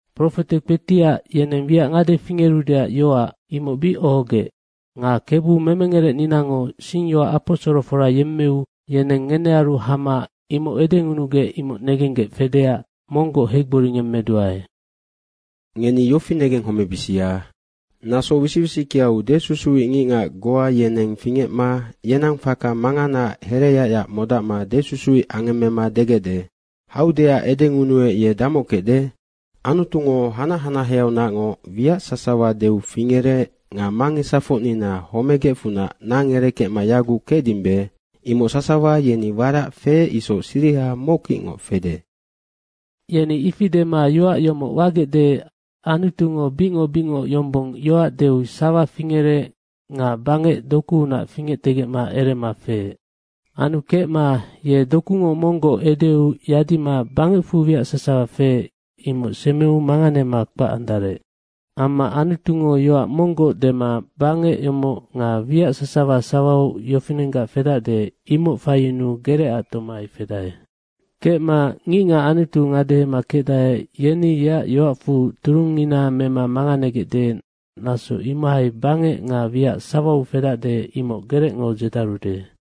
Profete kpetiac, yeneng wiac ngade fingerudeac yoac imoc bic ohogec. Nga Kebu memengerecninango singyoac aposorofora yemmeu yeneng ngenearu hama imoc edengunugec, imoc negenggec fedeac monggoc heigboringemmeduae. Ngeni yofinoc negenghomebisia. Naso wisic wisickeau desusuic ngicngac goa yeneng fingecma yenang faka manganaac hereyacyac modacma desusuic angemmema degecde, “Haudeac edengunuec, ye damoc kecde? Anutungo hanac hanaheaunacngoc wiac sasawa deu fingerec nga mangesafocnina homegecfunac nang erekecma yaguc kecdimbe, imoc sasawa yeni warac feec isoc siriha mockicngoc fede.” Yeni ifi dema yoac yomoc wagecde, Anutungo bicngoc bicngoc yombong yoac deu sawa fingerec nga bangec dokuunac fingectegecma erema feec. Anu kecma ye dokungoc monggoc edeu yadima bangecfu wiac sasawa feec, imoc semeu manganema kpac andarec. Amma Anutungo yoac monggoc dema, bangec yomoc nga wiac sasawa sawau yofinenggac fedacde, imoc faiyunuu gerecac tomai fedae. Kecma ngicngac Anutu ngadehema kecdae, yeni yeac yoacfu turungngina mema manganegecde, naso imohai bangec nga wiac sawau fedacde, imoc gerecngo dzedarude.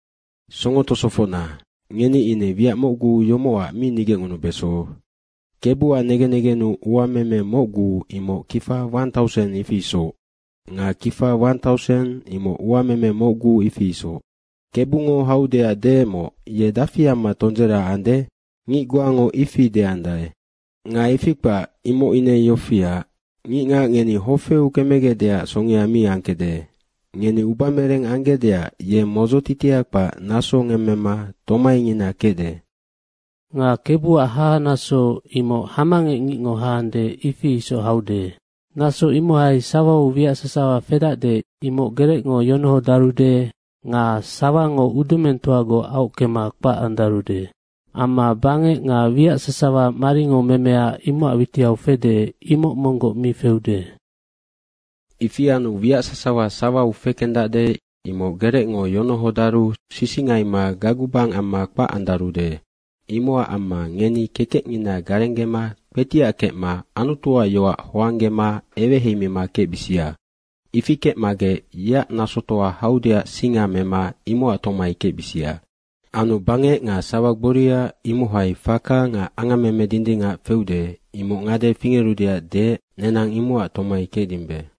Songo tosofocna, ngeni ine wiac mocgu yomocac mi nigecngunubeso, Kebuac negen negennu uameme mocgu imoc kifa wan tauseng, ifi isoc. Nga kifa wan tauseng, imoc uameme mocgu, ifi isoc. Kebungo haudaec deecmoc, ye dafi amma tondzera ande, ngic goango ifi deandae. Nga ifi kpac, imoc ine yofiac, ngicngac ngeni hofeu kemegecdeac songea mi angkecde. Ngeni ubamereng anggecdeac ye modzotitia kpac naso ngemmema tomaingina kecde. Nga Kebuac hahanaso, imoc hamangec ngicngo haandae, ifi isoc haude. Naso imohai sawau wiac sasawa fedacde, imoc gerecngo yonohodarude nga sawango udumengtoagoc aockema kpac andarude. Amma bangec nga wiac sasawa maringo memea imocac witiau fede, imoc monggoc mi feude. Ifi anu wiac sasawa sawau fekendacde, imoc gerecngo yonohodaru sisingaima gagubang amma kpac andarude. Imocac amma ngeni kekecngina garenggema kpetiac kecma Anutuac yoac hoanggema eweheimima kecbisia. Ifi kecmagec yeac nasotoa haudeac singa mema imocac tomai kecbisia. Anu bangec nga sawa gboria, imohai faka nga angammeme dindingac feude, imoc ngade fingerudeac deec, nenang imocac tomai kecdimbe.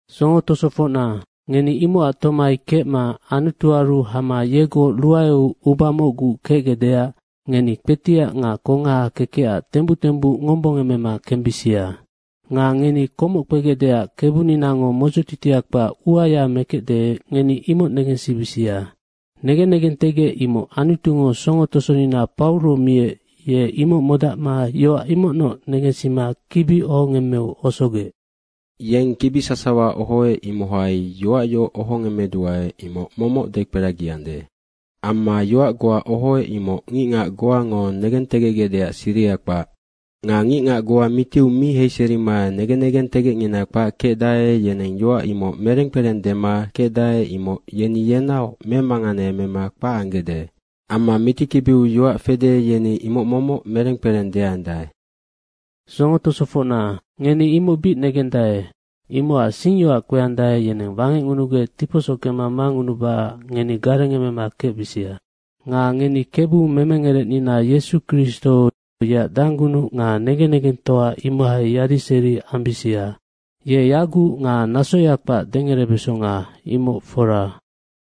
Songo tosofocna, ngeni imocac tomai kecma Anutuaru hama yegoc ruaeu uba mocgu kecgecdeac ngeni kpetiac nga kongaha kekecac tembuc tembuc ngombongemema kembisia. Nga ngeni komoc kpegecdeac Kebuninango modzotitia kpac uaya mekecde, ngeni imoc negensibisia. Nga negen negentegec imoc Anutungo songo tosonina Pauro miec, ye imoc modacma yoac imocnoc negensima kibi ohongemmeu osogec. Nga yeng kibi sasawa ohoec, imohai yoac yoc ohongemmeduae, imoc momoc dekperagiande. Amma yoac goa ohoec, imoc ngicngac goango negentegecgecdeac siriha kpac. Nga ngicngac goa mitiu mi heiserima negen negentegecngina kpac kecdae, yeneng yoac imoc mereng kpereng dema kecdae, imoc yeni yenaoc memanganeemema kpac anggecde. Amma mitikibiu yoac fede, yeni imoc momoc mereng kpereng deandae. Songo tosofocna, ngeni imoc bic negendae, imocac singyoac kpeandae, yeneng wangecngunugec tiposockema mangunubacac ngeni garengemema kecbisia. Nga ngeni Kebu memengerecnina Yesu Kristo yeac danggunuc nga negen negengtoa imohai yadiseri ambisia. Ye yaguc nga nasoya kpac dengerebesonga, imoc fora.